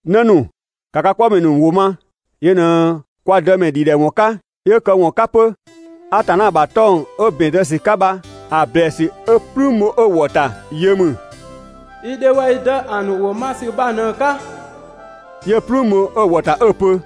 'Në ‑nu, ‑ka ka 'kpɔmɛ ‑nu ‑wʋ ma, yö ꞊në kwa Dëmɛ ‑dhidhɛwɔn 'ka, 'yö këwɔn 'ka 'pö. Atanna ‑bha 'tɔng‑ 'ö ‑bɛn zë ‑sü 'ka bha‑ ‑blɛɛsü 'ö "plüün bho 'ö‑ ‑wɔ ‑ta yö ‑mü: «I dhe waa‑ i dë ‑a ‑nu ‑wʋ ma ‑sü bha ꞊në‑ 'ka» 'yö "plüün bho 'ö‑ ‑wɔ ‑ta 'ö‑ pö: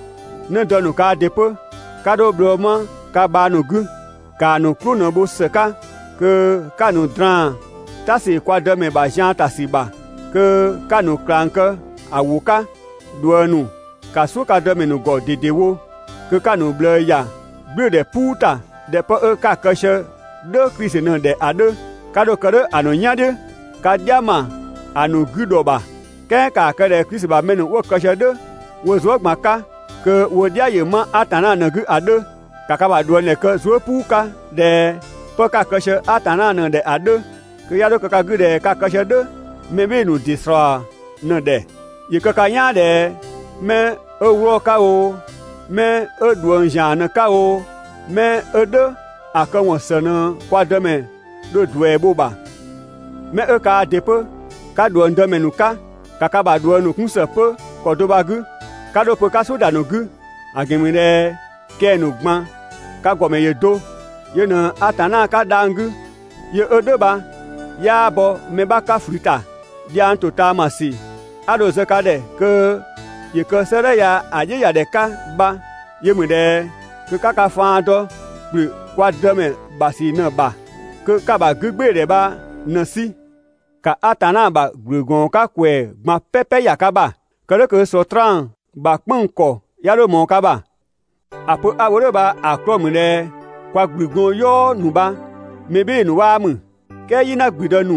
'Në dë ‑nu kaa ‑dɩ 'pö, 'ka 'dho bhlɔɔ 'ma ka bhang ‑nu 'gü. ‑Kaa ‑nu "klʋ ꞊në bho ‑së 'ka kö 'ka‑ ‑nu draan "ta ‑sü kwa Dëmɛ ‑bha zian ‑ta ‑sü ‑bha, kö 'ka‑ ‑nu ꞊klang kë ‑a ‑wʋ 'ka. ꞊Dhuëng ‑nu, ‑ka "suʋ̈ ka dëmɛ ‑nu ‑gɔ ꞊dedewo, kö 'ka‑ ‑nu ꞊bhlëë ‑ya "gblʋ̈ʋ̈dhɛ "puu ‑ta ꞊dhɛ 'pë 'ö 'ka‑ kë sië "dhʋ̈ Klisi ꞊në‑ ‑dhɛ ‑a 'dhö. 'Ka 'dho‑ kë "dhʋ̈ ‑a ‑nu "yan "dhiʋ̈ ka "dhia ‑ma ‑a ‑nu 'gü ‑dhɔ ‑bha. "Kɛɛ ‑kaa kë ꞊dhɛ Klisi ‑bha mɛ ‑nu 'wo‑ kë sië "dhʋ̈ wo zuë" ꞊gban 'ka kö wo "dhia ‑yö 'ma Atanna ꞊në‑ 'gü ‑a 'dhö. ‑Ka ka ‑bha ꞊dhuëngdhɛ kë zuë" "puu 'ka ꞊dhɛ 'pë 'ka‑ kë sië Atanna ꞊në‑ ‑dhɛ ‑a 'dhö, kö 'ya 'dho kë ka 'gü ꞊dhɛ ka‑ kë sië "dhʋ̈ mɛ "bhɩɩ‑ ‑nu ‑dɩ ‑slɔɔ ꞊në‑ ‑dhɛ. ‑Yö kë ka "yaan ꞊dhɛ 'mɛ 'ö 'wlɔɔ‑ 'ka oo, 'mɛ 'ö ꞊dhuëng ‑zian ꞊në‑ 'ka oo, 'mɛ 'ö "dhʋ̈ ‑a këwɔn ‑së ꞊në kwa Dëmɛ dho‑ ‑duɛ bho‑ ‑bha. 'Mɛ 'ö kaa ‑dɩ 'pö 'ka ꞊dhuëng dëmɛ ‑nu 'ka, ‑ka ka ‑bha ꞊dhuëng ‑nu 'kun ‑së 'pö ‑kɔ do bha‑ 'gü. 'Ka 'dho‑ pö 'ka "suʋ̈ ‑da ‑nu 'gü, ‑a ‑gɛn ‑mü ꞊dhɛ kɛng‑ ‑nu ꞊gban ka ‑gɔmɛ ‑yö do, yö ꞊në Atanna 'ka dhang‑ 'gü, yö 'ö "dhʋ̈ bha 'yaa bɔ mɛ 'bha 'ka ꞊flü ‑ta. Dhiang ‑totaamasü 'a dho‑ zë ka ‑dhɛ kö ‑yö kë 'sëëdhɛ ya‑ "dhiʋ̈ ‑ya ‑dhɛ 'ka bha yö ‑mü ꞊dhɛ kö 'ka ka faan dɔ ‑kplü kwa Dëmɛ ‑bha ‑sü ꞊në‑ ‑bha, kö 'ka‑ ‑bha 'gügbɩɩdhɛ bha ꞊në‑ 'sü. ‑Ka Atanna ‑bha ‑gblü ‑gɔɔn 'ka ‑kwɛɛ ꞊gban "pɛpɛ ‑ya ka ‑bha. Kë "dhʋ̈ kö Sɔtraan ‑bha "kpënng‑ ‑kɔ 'ya 'dho ꞊mɔɔ ka ‑bha. ‑A pö 'a‑ wo "dhʋ̈ bha‑ 'klɔɔ‑ ‑mü ꞊dhɛ kwa ‑gblügɔɔn "yɔɔ ‑nu bha mɛ "bhɩɩ‑ ‑nu 'waa ‑mü. "Kɛɛ "yina ‑gblüdë ‑nu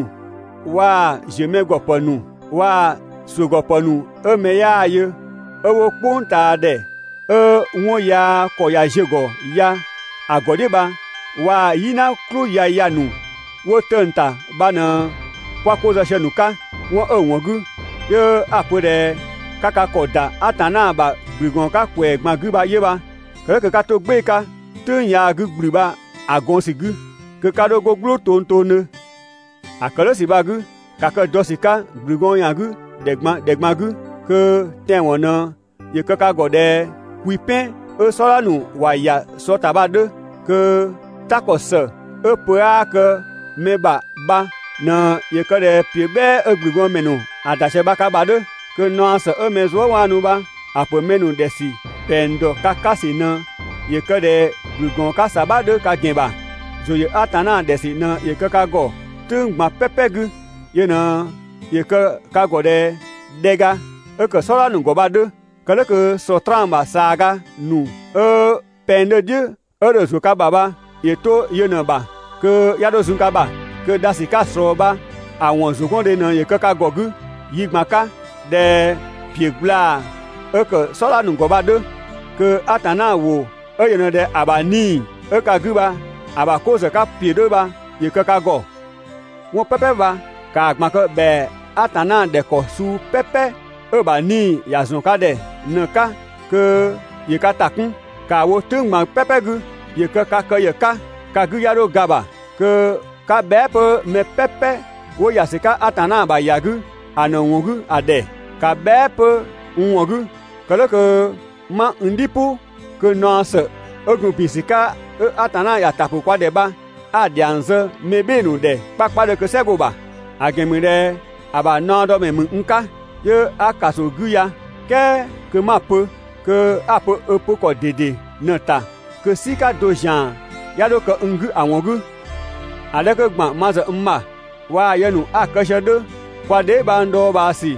waa‑ ‑ziö mɛ ‑gɔ ‑pë ‑nu waa‑ ‑suʋ̈gɔpë ‑nu 'ö mɛ 'yaa yö 'ö 'wo "kpʋngtaadhɛ 'ö 'wɔn yaa ‑kɔ ꞊ya ziö‑ ‑gɔ ya‑ ‑gɔ "dhiʋ̈ bha waa‑ "yina "klʋ yaya ‑nu 'wo 'tëng‑ ‑ta bha ꞊në 'kwa 'ko zë sië‑ ‑nu 'ka. 'Wɔn 'ö‑ ‑wɔn 'gü, 'yö 'a‑ pö ꞊dhɛ 'ka ka ‑kɔ ‑da Atanna ‑bha ‑gblü ‑gɔɔn 'ka ‑kwɛɛ ꞊gban 'gü bha 'yö bha. Kë "dhʋ̈ kö 'ka 'to‑ "gbɩɩ‑ 'ka "tʋ̈ng yaa 'gü ‑gblü bha‑ gɔn ‑sü 'gü, kö 'ka 'dho 'go "gblʋʋ tongtongdhö. ‑A ‑kë "dhʋ̈ ‑sü bha‑ 'gü, ‑ka kë dɔ ‑sü 'ka ‑gblü gɔɔn ‑yan 'gü ‑dhɛ ꞊gban ‑dhɛ ꞊gban 'gü, kö tɛanwɔn ꞊në ‑yö kë ka ‑gɔ ꞊dhɛ kwi "pɛn 'ö "sɔdha ‑nu ‑wa ‑ya sɔ ‑ta bha‑ 'dhö, kö "ta ‑kɔ ‑së 'ö pö 'aa kë mɛ ‑bha bha ꞊në ‑yö kë ꞊dhɛ ‑piö "bhɛɛ 'ö ‑gblügɔɔnmɛ ‑nu ‑wa ‑da ꞊sië bha ka ‑bha 'dhö. Kö naɔ ‑së 'ö mɛ zuëwaanu bha‑ ‑pö mɛ ‑nu ‑dhɛ ‑sü ‑pɛng ‑dɔ ka 'ka ‑sü ꞊në ‑yö kë ꞊dhɛ ‑gblügɔɔn 'ka ‑sabha 'dhö ka ‑gɛn ‑bha. ‑Zʋ ‑yö Atanna ‑dhɛ ‑sü ꞊në ‑yö kë ka ‑gɔ "tʋ̈ng ꞊gban "pɛpɛ 'gü. Yö ꞊në ‑yö kë ka ‑gɔ ꞊dhɛ dhɛga 'ö ‑kë "sɔdha ‑nu ‑gɔ bha‑ 'dhö. Kë "dhʋ̈ kö Sɔtraan ‑bha ꞊saaga ‑nu 'ö pɛng 'dhö‑ "dhiʋ̈ 'ö dho‑ ‑zuö ka ‑bha bha ‑yö 'to yö ꞊në‑ ‑bha kö 'ya 'dho zun ka ‑bha. Kö dha ‑sü 'ka‑ ꞊slɔɔ bha‑ ‑wɔn ‑zʋgɔndhe ꞊në ‑yö kë ka ‑gɔ 'gü yi ꞊gban 'ka ꞊dhɛ ‑piö gblaa‑ 'ö ‑kë "sɔdha ‑nu ‑gɔ ‑bha bha‑ 'dhö. Kö Atanna ‑wʋ 'ö yö ꞊në ꞊dhɛ ‑a ‑bha 'Nii‑ 'ö ka 'gü bha‑ ‑bha 'ko ‑zë 'ka ‑piö 'dhö bha ‑yö kë ka ‑gɔ. 'Wɔn "pɛpɛ bha ‑kaa ꞊gban kë ‑bhɛa Atanna ‑dhɛ ‑kɔ suu "pɛpɛ 'ö‑ ‑bha 'Nii‑ ‑ya ‑zɔn ka ‑dhɛ ꞊në‑ 'ka kö ‑yö ka ‑ta 'kun, ‑kaa wo "tʋ̈ng ꞊gban "pɛpɛ 'gü. ‑Yö kë ka kë ‑yë 'ka ka 'gü 'ya 'dho ga‑ ‑bha. Kö 'ka bhɛa" 'pö mɛ "pɛpɛ 'wo ‑ya ‑sü 'ka Atanna ‑bha ‑ya 'gü ‑a ‑nu ‑wɔn 'gü ‑a ‑dhɛ. ‑Ka bhɛa" 'pö n ‑wɔn 'gü, kë "dhʋ̈ kö 'ma n "dhi "pʋ kö naɔ ‑së 'ö gun ‑bin ‑sü 'ka 'ö Atanna ‑ya ‑ta ‑pʋ kwa ‑dhɛ bha 'a‑ ‑dhiang zë mɛ "bhɩɩ‑ ‑nu ‑dhɛ 'kpakpadhö kö "sɛ‑ 'go‑ ‑bha. ‑A ‑gɛn ‑mü ꞊dhɛ ‑a ‑bha naɔdɔmɛ ‑mü n 'ka, 'yö 'a‑ ‑kaso 'gü ya, "kɛɛ kö 'ma‑ pö kö 'a‑ pö‑ pö ‑kɔ ꞊dede ꞊në‑ ‑ta kö "sika do ‑zian 'ya 'dho kë n 'gü ‑a ‑wɔn 'gü. ‑A 'dhɛ 'kö ‑gban ma ‑zë n ‑bha waa‑ yë ‑nu 'a‑ kë sië‑ 'dhö, kwa dheebhang dhɔɔbhaa ‑sü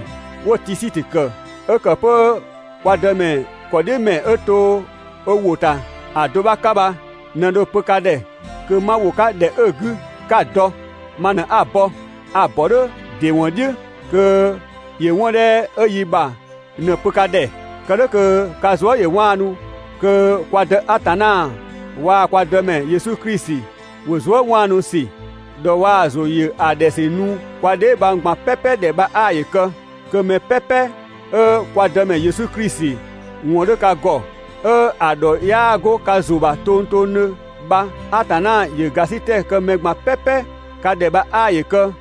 'wo‑ Tisikö ‑kë 'ö ‑kë 'pö kwa Dëmɛ ‑kɔdhiʋ̈mɛ 'ö to ö ‑wʋ ‑ta ‑a do 'bha 'ka bha ꞊në dho‑ pö ka ‑dhɛ kö 'ma ‑wo 'ka ‑dhɛ 'ö‑ 'gü 'ka‑ dɔ. Ma ꞊në 'a‑ bɔ. A‑ ‑bɔ "dhʋ̈ ‑dɩ ‑wɔn "dhiʋ̈ kö ‑yö 'wɔn 'dhɛ 'ö yi ‑bha ꞊në‑ pö ka ‑dhɛ. Kë "dhʋ̈ kö ka zuë" ‑yö 'waanu. Kö kwa Dë Atanna waa‑ kwa Dëmɛ Yesu Klisi ‑wo zuëwaanusü, ‑dhɔ waa‑ ‑zʋ ‑yö ‑a ‑dhɛ ‑sü nu kwa dheebhang ꞊gbang "pɛpɛ ‑dhɛ bha 'aa ‑yö kë kö 'mɛ "pɛpɛ 'ö kwa Dëmɛ Yesu Klisi ‑wɔn 'dhö ka ‑gɔ, 'ö‑ ‑dhɔ 'yaa 'go ka ‑zʋ ‑bha tongtongdhö bha Atanna ‑yö ‑gasitɛ kë mɛ ꞊gban "pɛpɛ ka ‑dhɛ bha 'aa ‑yö kë.